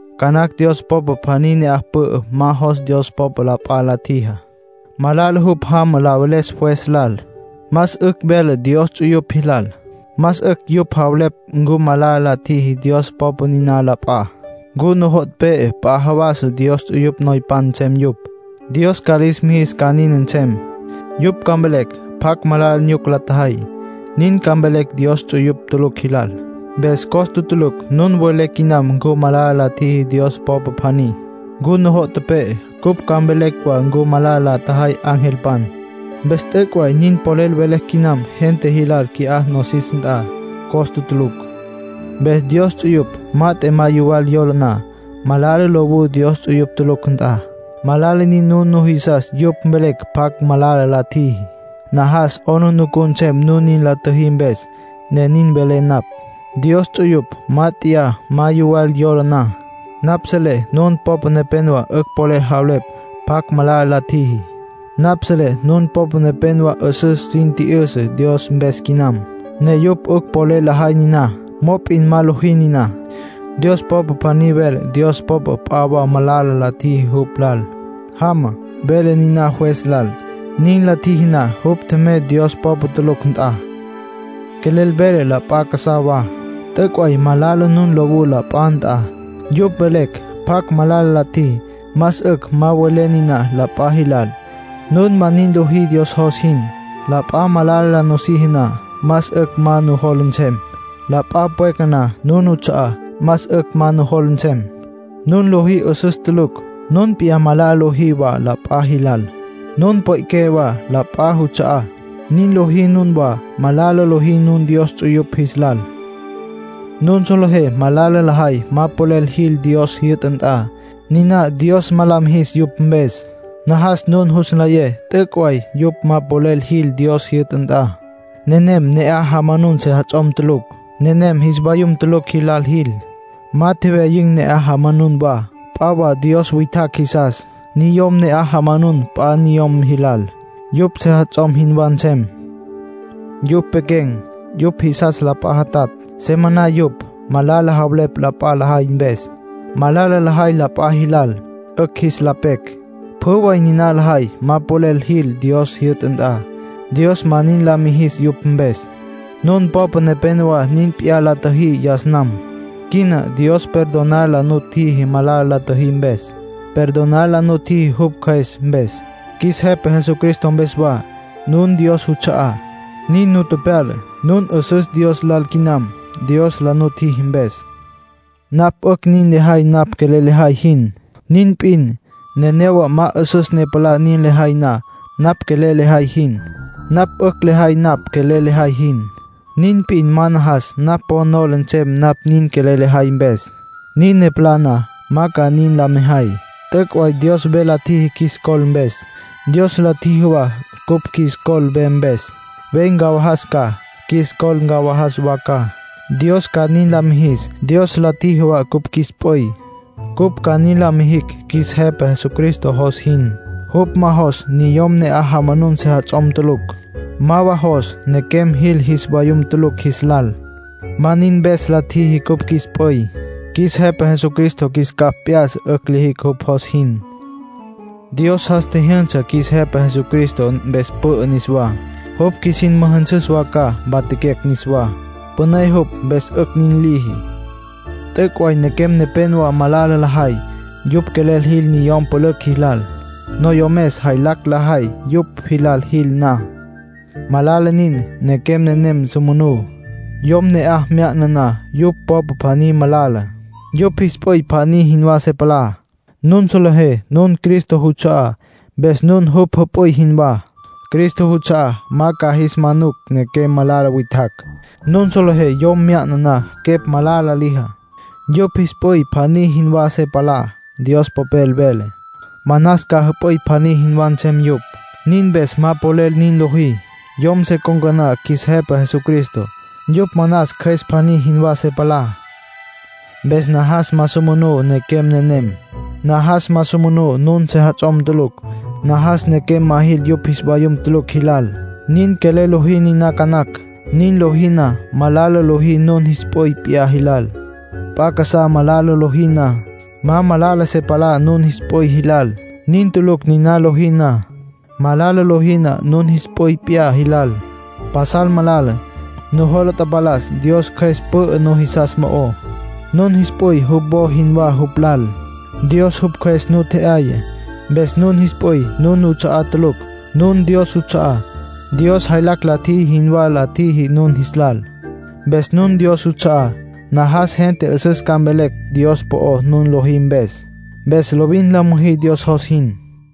Ca nacj Dios popa pjaní ne'aj pü'ü ma jos Dios popa la p'a la tjijá. Malala jupj jama la veles juez lal. Más 'ücj vele Dios ts'uyupj jilal. Más 'ücj yupj javelepj ncu malala la tjiji Dios popa niná la p'a. ¿Ncu nujo' tepe'e p'a jawas Dios ts'uyupj noypan nsem yupj, Dios ca lis mijis ca nin nsem? Yupj ca mvelecj pjacj malala nyuca la tjajay. Nin ca mvelecj Dios ts'uyupj tulucj jilal. Mpes costa tulucj nun welé quinam ncu malala la tjiji Dios popa pjaní. ¿Ncu nujo' tepe'e cupj ca mvelecj wa ncu malala la tjajay angelpan? Mpes t'üc' way nin polel velecj quinam gente jilal qui'á nosis nt'a. Costa tulucj. Mpes Dios ts'uyupj mat'e ma yuwal yola na, malala lowú Dios ts'uyupj tulucj nt'a. Malala nin nun nujisas yupj mvelecj pjacj malala la tjiji. Najas 'aplijila nsem nun nin la tjüjí mpes, ne nin velé napj. Dios ts'uyupj mát'eya ma yuwal yola na, napj selé nun popa nepénowa 'ücj polel javelepj pjacj malala la tjiji. Napj selé nun popa nepénowa 'üsüs sin tji'yüsa Dios mpes quinam, ne yupj 'ücj polel lajay niná. Mop'in ma lojí niná. Dios popa pjaní vele Dios popa p'a wa malala la tjiji jupj lal. Jama, vele niná juez lal. Nin la tjiji na, jupj tjemey Dios popa tulucj nt'a. Quelel velé la p'a casá wa. T'üc' way malala nun lowú la p'a nt'a, yupj mvelecj pjacj malala la tjiji. Más 'ücj ma welé niná la p'a jilal. Nun ma nin lojí Dios jos jin. La p'a malala la nusiji na, más 'ücj ma nujola nsem. La p'a pweca na nun nuts'a'á, más 'ücj ma nujola nsem. Nun lojí 'üsüs tulucj. Nun p'iyá malala lojí wa la p'a jilal. Nun pwe'qué wa la p'a juts'a'á. Nin lojí nunwá, malala lojí nun Dios ts'uyupj jis lal. Nun solejé malala lajay ma polel jil Dios jyü'ta nt'a. Niná Dios ma la mijis yupj mpes. Najas nun jus nlayé t'üc' way yupj ma polel jil Dios jyü'ta nt'a. Nenem ne'aj jamanun sejats'om tulucj. Nenem jis vayum tulucj jilal jil. Ma tjewyayin̈ ne'aj jamanun wa. P'a wa dios witjacj jisas. Niyom ne'aj jamanun p'a niyom jilal, yupj sejats'om jinwá nsem. Yupj pequen̈. Yupj jisas la p'a jatatj. Se maná yupj. Malala javelepj la p'a lajay mpes. Malala lajay la p'a jilal, 'ücj jis la pecj. Pjü way niná lajay ma polel jil Dios jyü'ta nt'a. Dios ma nin la mijis yupj mpes. Nun popa nepénowa nin p'iyá la tjüjí yas nam. Quina Dios perdonar la nutjiji malala la tjüjí mpes. Perdonar la nutjiji jupj Cjües mpes, qjuis Jepa Jesucristo mpes wa. Nun Dios juts'a'á, nin nu tepyala. Nun 'üsüs Dios lal quinam, Dios la nutjiji mpes. Napj 'ücj nin lejay napj quelel lejay jin. Nin p'in, nenéyawa ma 'üsüs ne palá nin lejay na napj quelel lejay jin. Napj 'ücj lejay napj quelel lejay jin. Nin p'in ma najas napj po nola nsem napj nin quelel lejay mpes. Nin ne palá na, ma ca nin la mejay. T'üc' way Dios ve la tjiji qjuis col mpes. Dios la tjiji wa cupj qjuis col ve mpes. Ve ncawajas ca, qjuis col ncawajas wa ca, Dios ca nin la mijis. Dios la tjiji wa cupj qjuis p'üy, cupj ca nin la mijicj qjuis Jepa Jesucristo jos jin. Jupj ma jos niyom ne'aj jamanun sejats'om tulucj. Ma wa jos nequem jil jis vayum tulucj jis lal. Ma nin mpes la tjiji cupj qjuis p'üy. Qjuis Jepa Jesucristo qjuis capj p'ya'sa 'ücj lijicj jupj jos jin. Dios jas tjijyünsa qjuis Jepa Jesucristo, mpes pü'ü niswá. Jupj qjuisin müjünsüs wa ca, mpatjaquecj niswá. Püné jupj, mpes 'ücj nin liji. T'üc' way nequem nepénowa pajal malala lajay. Yupj quelel jil niyom pülücj jilal. Noyomes jaylacj lajay yupj jilal jil na. Malala nin, nequem nenem su manú. Yom ne'aj mya'na na yupj popa pjaní, malala. Yupj jis p'üy pjaní jinwá se palá. Nun solejé nun Cristo juts'a'á, mpes nun jupj jüp'üy jinwá. Cristo juts'a'á ma ca jis manucj nequem malala witjacj. Nun solejé yom mya'na na quepj malala lijá, yupj jis p'üy pjaní jinwá se palá. Dios Popel vele: “Manas ca jüp'üy pjaní jinwá nsem yupj”. Nin mpes ma polel nin lojí. Yom se con̈ca na qjuis Jepa Jesucristo, yupj manas cjües pjaní jinwá se palá. Mpes najas ma su manú nequem nenem. Najas ma su manú nun sejats'om tulucj. Najas nequem ma jil yupj jis vayum tulucj jilal. Nin quelel lojí niná ca nacj. Nin lojí na, malala lojí nun jis p'üy p'iyá jilal. P'a casá malala lojí na, ma malala se palá nun jis p'üy jilal. Nin tulucj niná lojí na. Malala lojí na nun jis p'üy p'iyá jilal, pasal malala. Nujola tapalas Dios Cjües pü'ü nujisas mo'ó. Nun jis p'üy jupj wo jinwá jupj lal. Dios jupj Cjües nu tje'yaya. Mpes nun jis p'üy nun nuts'a'á tulucj. Nun Dios juts'a'á. Dios jaylacj la tjiji jinwá la tjiji nun jis lal. Mpes nun Dios juts'a'á. Najas gente 'üsüs ca mvelecj Dios po'ó, nun lojí mpes. Mpes lovin la müjí Dios jos jin.